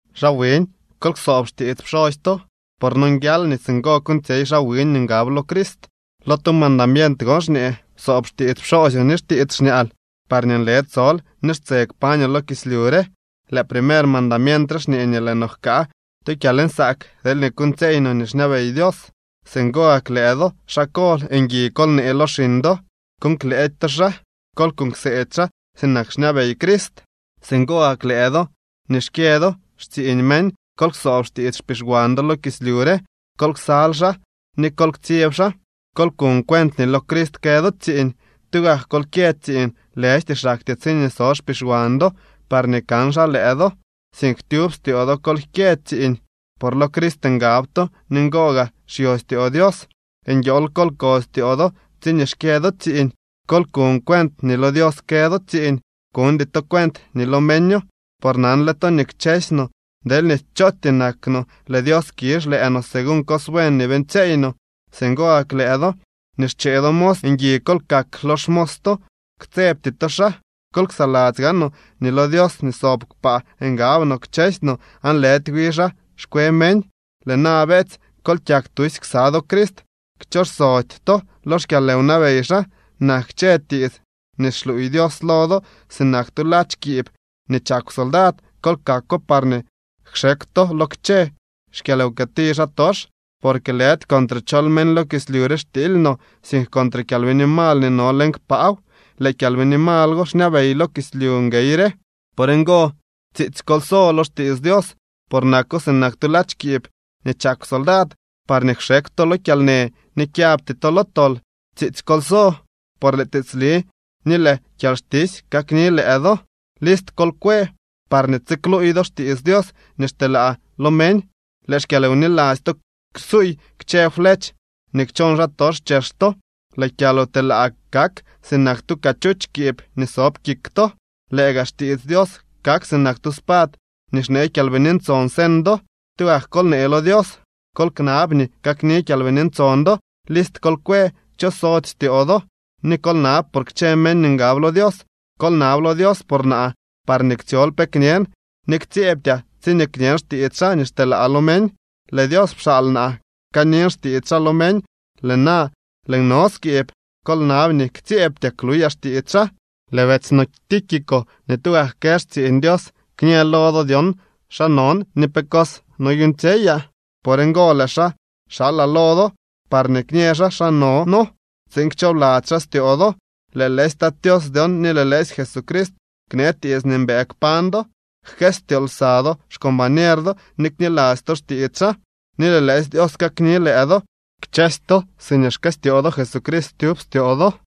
Xaa wiñ, kol ksoob xtiits pxosy to, por nonguial nii singo kuuñtsyey xaa wiñ nii ngab lo Crist. Lo tu mandamient gon xñee: “Psoob xtiits pxoosyoo ni xtiits xñaal parñee nle tsol ni xtse kpañoo lo kislyu re.” Lëë primer mandamient re xñee nii lëë no jkaa tu kyalnsaak deelñee kuuñtsyeey no nii xñabey Dios. Singo gak lëë do, xaa kol, ngui kol nee lo xiñ do. Kuuñ klëëdy to xaa. Kol kuuñ kseedy xaa sinak xñabey Crist. Singo gak lëë do nii xkyë do xtsiiñ meñ, kol ksoob xtiits xpixwan do lo kislyu re. Kol ksal xaa ni kol ktsyeb xaa. Kol kuñ cuent nii lo Crist kë do tsiiñ. Tugak kol kyë tsiiñ, lëjty xaktyee tsiñee so xpixwan do parñee kan xaa lëë do, sink tyub styoo do kol kyë tsiiñ, por lo Crist ngab to ni ngo gaa xyo styoo Dios. Nguiool kol ko styoo do tsiñee xkyë do tsiiñ. Kol kuñ cuent nii lo Dios kë do tsiiñ, kuñdy to cuent nii lo meño. Por nanle to nii kchësy no deelñee chootyee nak no, lëë Dios kizh lëë no según cos buen nii beeñtsyeey no. Singo gak lëë do nii xchee do mos, ngui kol kak lo xmos to, ktsebty to xaa. Kol ksaladzy gaanoo nii lo Dios nii sob kpaa ngab no kchësy no aan lëdy wi xaa xkwe meñ. Lëë na, beetsy, kol kyak tusy ksa do Crist. Kchooxsody to lo xkyalwnabey xaa. Nak kchë tiits nii xluuy Dios lo do sinak tu ladx kiib nii chakw soldad. Kol kakwo parñee kxekw to lo kchë xkyalwkëti xaatox. Porque lëdy contre chol meñ lo kislyu re xtiily no, sink contre kyalbini mal nii no leñ kpaaw. Lëë kyalbini mal go xñabey lo kislyu nguey re. Por ngo, tsiitsy kol so lo xtiits Dios, por nako sinak tu ladx kiib nii chakw soldad, parñee kxekw to lo kyalnë ni kyabty to lo tol. Tsiitsy kol so, por lëë tiitsli ni lëë kyalxtisy kakni lëë do. List kol kwe parñee tsikluuy do xtiits Dios nii xteelaa lo meñ. Lëë xkyalwniladzy to ksuuy kchë flech nii kchoon xaatox chex to. Lëë kyalwtelaa kak sinak tu cachuch kiib nii sob kik to. Lëë gaa xtiits Dios kak sinak tu spad nii xnee Kyalbini Ntson señ do. Tugak kol nee lo Dios, kol knab nii kakni Kyalbini Ntson do. List kol kwë, kchosody styoo do ni kol nab por kchë meñ nii ngab lo Dios. Kol nab lo Dios por naa parñee ktsyol pe kñen ni ktsyeebtyaa tsiñee kñen xtiits xaa nii xteelaa lo meñ. Lëë Dios pxaal naa kanin xtiits xaa lo meñ. Lëë na lëën no skiib. Kol nab nii ktsyeebtyaa kluyaa xtiits xaa. Lëë betsy no Tíquico nii tugak kë xtsiiñ Dios kñë lo do dyon xa non ni pe cos noyuuñtsyeyaa. Por ngo lëë xaa xalaa lo do, parñee kñë xaa xa no noo tsiin kchoobladzy xaa styoo do. Lëë lëësy Tat Tios dyon ni lëë lëësy Jesucrist knee tiits nii mbëë kpañ do, jkëstyoo lsa do xcombañer do ni kniladzy to xtiits xaa. Ni lëë lëësy Dios kakni lëë do kchësy to siñee xkëstyoo Jesucrist tyub styoo do.